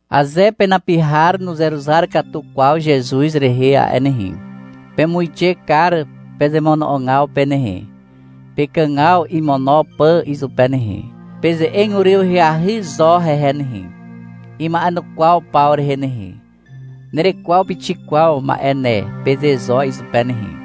Aze penapi har nuzeruzar katu kwaw Zezuz rehe a'e nehe, pemuixe kar pezemono'ogaw pe nehe, pekàgaw imono pà izupe nehe. Peze'eg uryw ahyahy zo hehe nehe, ima'enukwaw paw rehe nehe. — Nerekwaw pixik kwaw ma'e ne, peze zo izupe nehe.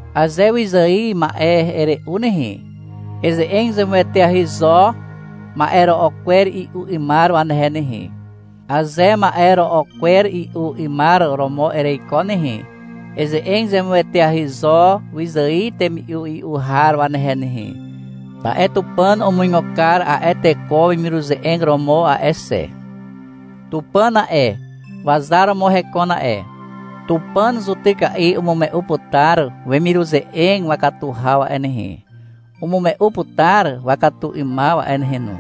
Aze wyzài ma'e ere'u nehe, eze'eg zemueteahy zo ma'ero'o kwer i'u 'ymar wanehe nehe. Aze ma'e ro'o kwer i'u 'ymar romo ereiko nehe, eze'eg zemueteahy zo wyzài temi'u i'u har wanehe nehe. Ta'e Tupàn umuigo kar a'e teko wemiruze'eg romo a'e xe. Tupàn a'e, wazar romo hekon a'e. Tupàn zutyka'i umume'u putar wemiruze'eg wakatu haw a'e nehe, umume'u putar wakatu 'ymaw a'e nehe no.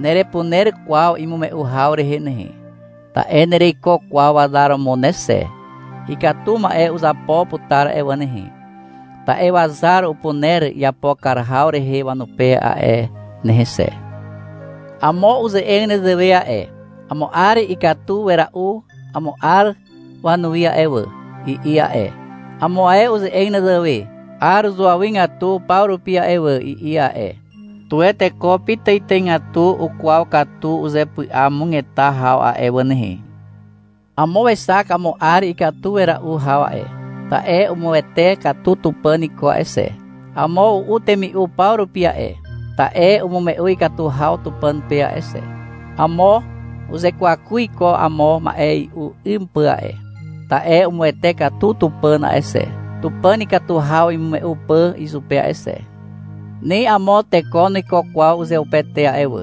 Nerepuner kwaw imume'u haw rehe nehe, ta'e nereiko kwaw wazar romo ne xe. Ikatu ma'e uzapo putar a'e wà nehe, ta'e wazar upuner iapo kar haw rehe wanupe a'e nehe xe. Amo uze'eg nezewe a'e. — Amo 'ar ikatu wera'u amo 'ar wanuwi a'e wà, i'i a'e. Amo ae uze'eg nezewe. 'Ar uzuawygatu paw rupi a'e wà, i'i a'e. Tuwe teko pitàitàigatu ukwaw katu uzepy'amugeta haw a'e wà nehe. Amo wexak amo 'ar ikatu wera'u haw a'e, ta'e umuwete katu Tupàn iko a'e xe. Amo u'u temi'u paw rupi a'e, ta'e umume'u ikatu haw Tupàn pe a'e xe. Amo uzekwaku iko amo ma'e i'u 'ym pà a'e, ta'e umuwete katu Tupàn a'e xe, Tupàn ikatu haw imume'u pà izupe a'e xe. Ni amo teko nuiko kwaw uzeupete a'e wà.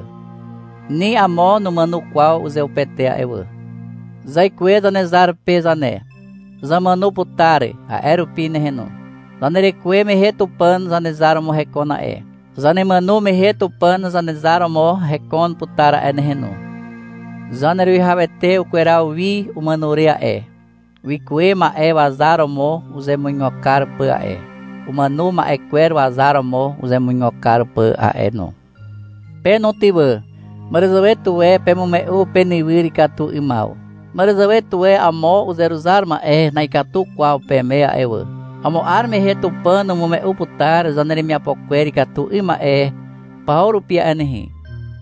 Ni amo numàno kwaw uzeupete a'e wà. Zaikuwe Zanezar pe zane. Zamàno putar a'e rupi nehe no. Zanerekuwe mehe Tupàn Zanezar romo hekon a'e. Zanemàno mehe Tupàn Zanezar romo hekon putar a'e nehe no. Zaneruwihawete ukweraw wi umàno re a'e, wikuwe ma'e wazar romo uzemuigo kar pà a'e, umàno ma'e kwer wazar romo uzemuigo kar pà a'e no. Pe no ty wà. — Màràzàwe tuwe pemume'u penywyr ikatu 'ymaw. Màràzàwe tuwe amo uzeruzar ma'e na'ikatu kwaw peme a'e wà. Amo 'ar mehe Tupàn umume'u putar zaneremiapo kwer ikatu 'ym ma'e paw rupi a'e nehe.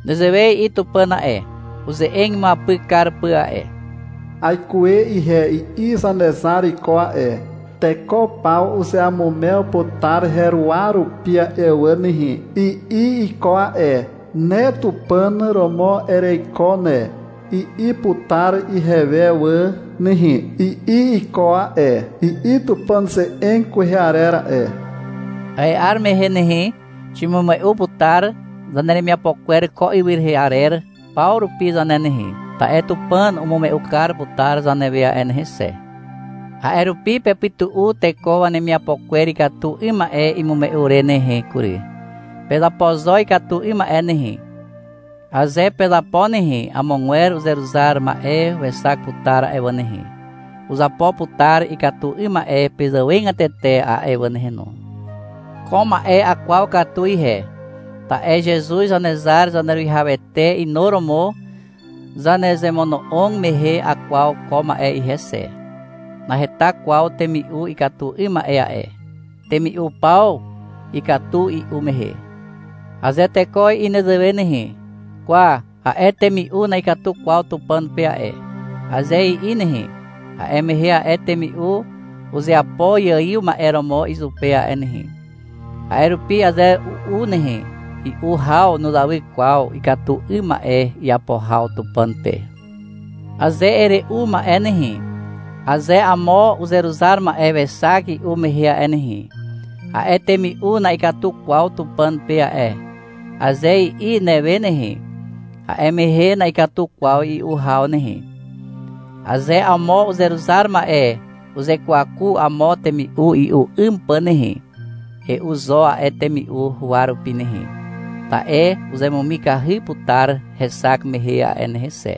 Nezewe i'i Tupàn a'e, uze'eg imuapyk kar pà a'e. — Aikuwe ihe, i'i Zanezar iko a'e. — Teko paw uzeamumew putar heruwa rupi a'e wà nehe, i'i iko a'e. — Ne Tupàn romo ereiko ne, i'i putar ihewe wà nehe, i'i iko a'e, i'i Tupàn ze'eg kwehe arer a'e. A'e 'ar mehe nehe, ximume'u putar zaneremiapo kwer ko ywy rehe arer paw rupi zane nehe, ta'e Tupàn umume'u kar putar zanewe a'e nehe xe. A'e rupi pepytu'u teko wanemiapo kwer ikatu 'ym ma'e imume'u re nehe kury. Pezapo zo ikatu 'ym ma'e nehe. Aze pezapo nehe, amogwer uzeruzar ma'e wexak putar a'e wà nehe, uzapo putar ikatu 'ym ma'e pezàwegatete a'e wà nehe no. Ko ma'e akwaw katu ihe, ta'e Zezuz Zanezar Zaneruwihawete inuromo zanezemono'og mehe akwaw ko ma'e ihe xe. Naheta kwaw temi'u ikatu 'ym ma'e a'e. Temi'u paw ikatu i'u mehe. Aze teko i'i nezewe nehe, — Kwa, a'e temi'u na'ikatu kwaw Tupàn pe a'e, aze i'i nehe, a'e mehe a'e temi'u uzeapo iaiw ma'e romo izupe a'e nehe. (A'e rupi, aze u'u nehe, i'u haw nuzawy kwaw ikatu 'ym ma'e iapo haw Tupàn pe.) Aze ere'u ma'e nehe, aze amo uzeruzar ma'e wexak i'u mehe a'e nehe, — A'e temi'u na'ikatu kwaw Tupàn pe a'e, aze i'i newe nehe, a'e mehe na'ikatu kwaw i'u haw nehe. Aze amo uzeruzar ma'e uzekwaku amo temi'u i'u 'ym pà nehe, e'u zo a'e temi'u huwa rupi nehe, ta'e uzemumikahy putar hexak mehe a'e nehe xe.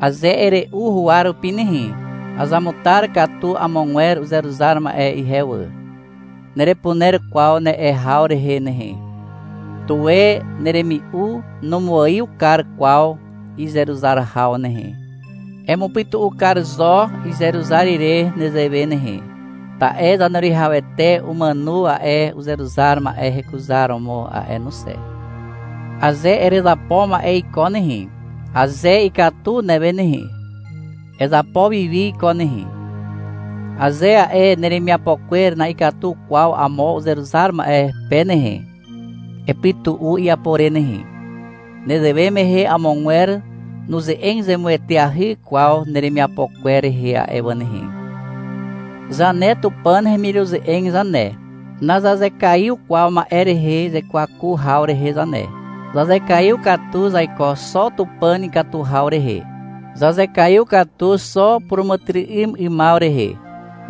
Aze ere'u huwa rupi nehe, — Azamutar katu amogwer uzeruzar ma'e ihe wà, nerepuner kwaw ne'e haw rehe nehe. Tuwe neremi'u numuaiw kar kwaw izeruzar haw nehe, emupytu'u kar zo izeruzar ire nezewe nehe, ta'e Zaneruwihawete umàno a'e uzeruzar ma'e hekuzaromo a'e no xe. Aze erezapo ma'e iko nehe, aze ikatu newe nehe, ezapo wi wi iko nehe. Aze a'e neremiapo kwer na'ikatu kwaw amo uzeruzar ma'e pe nehe, epytu'u iapo re nehe. Nezewe mehe amogwer nuze'eg zemueteahy kwaw neremiapo kwer rehe a'e wà nehe. Zane Tupàn hemiruze'eg zane, nazazekaiw kwaw ma'e rehe zekwaku haw rehe zane. Zazekaiw katu zaiko xo Tupàn ikatu haw rehe. Zazekaiw katu xo puràmàtyry'ym 'ymaw rehe.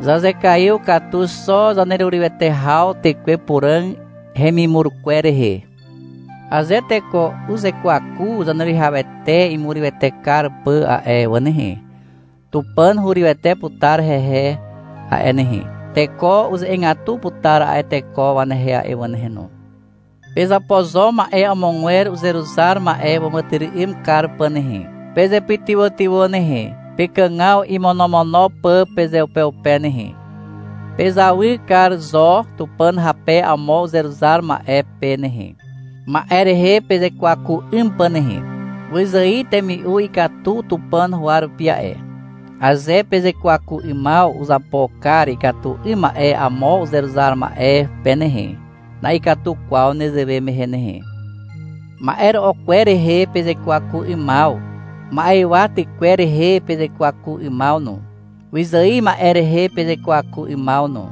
Zazekaiw katu xo zanerurywete haw Tekwe Puràg hemimur kwer rehe. Aze teko uzekwaku Zaneruwihawete imurywete kar pà a'e wà nehe, Tupàn hurywete putar hehe a'e nehe. Teko uze'egatu putar a'e teko wanehe a'e wà nehe no. Pezapo zo ma'e amogwer uzeruzar ma'e wàmàtyry'ym kar pà nehe. Pezepytywàtywà nehe, pekàgaw imonomono pà pezeupeupe nehe. Pezawy kar zo Tupàn hape amo uzeruzar ma'e pe nehe, ma'e rehe pezekwaku 'ym pà nehe. Wyzài temi'u ikatu Tupàn huwa rupi a'e. Aze pezekwaku 'ymaw uzapo kar ikatu 'ym ma'e amo uzeruzar ma'e pe nehe, na'ikatu kwaw nezewe mehe nehe. Ma'ero'o kwer rehe pezekwaku 'ymaw, ma'ywa tykwer rehe pezekwaku 'ymaw no, wyzài ma'e rehe pezekwaku 'ymaw no,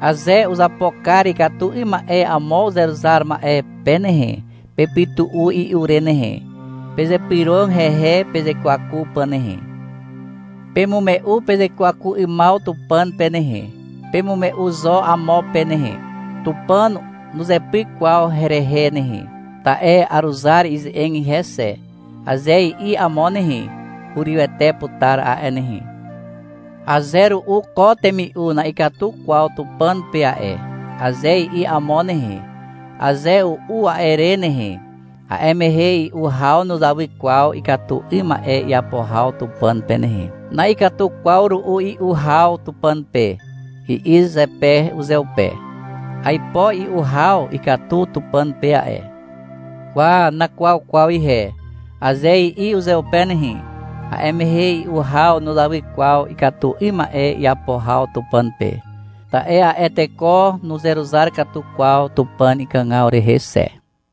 aze uzapo kar ikatu 'ym ma'e amo uzeruzar ma'e pe nehe, pepytu'u i'u re nehe. Pezypyrog hehe pezekwaku pà nehe. Pemume'u pezekwaku 'ymaw Tupàn pe nehe, pemume'u zo amo pe nehe. — Tupàn nuzepyk kwaw herehe nehe, ta'e aruzar ize'eg ihe xe, aze i'i amo nehe, hurywete putar a'e nehe. Aze ru'u ko temi'u na'ikatu kwaw Tupàn pe a'e, aze i'i amo nehe, aze u'u a'e re nehe, a'e mehe i'u haw nuzawy kwaw ikatu 'ym ma'e iapo haw Tupàn pe nehe. — Na'ikatu kwaw ru'u i'u haw Tupàn pe, i'i zepe uzeupe. — Aipo i'u haw ikatu Tupàn pe a'e. Kwa, nakwaw kwaw ihe, aze i'i uzeupe nehe, a'e mehe i'u haw nuzawy kwaw ikatu 'ym ma'e iapo haw Tupàn pe. Ta'e a'e teko nuzeruzar katu kwaw Tupàn ikàgaw rehe xe.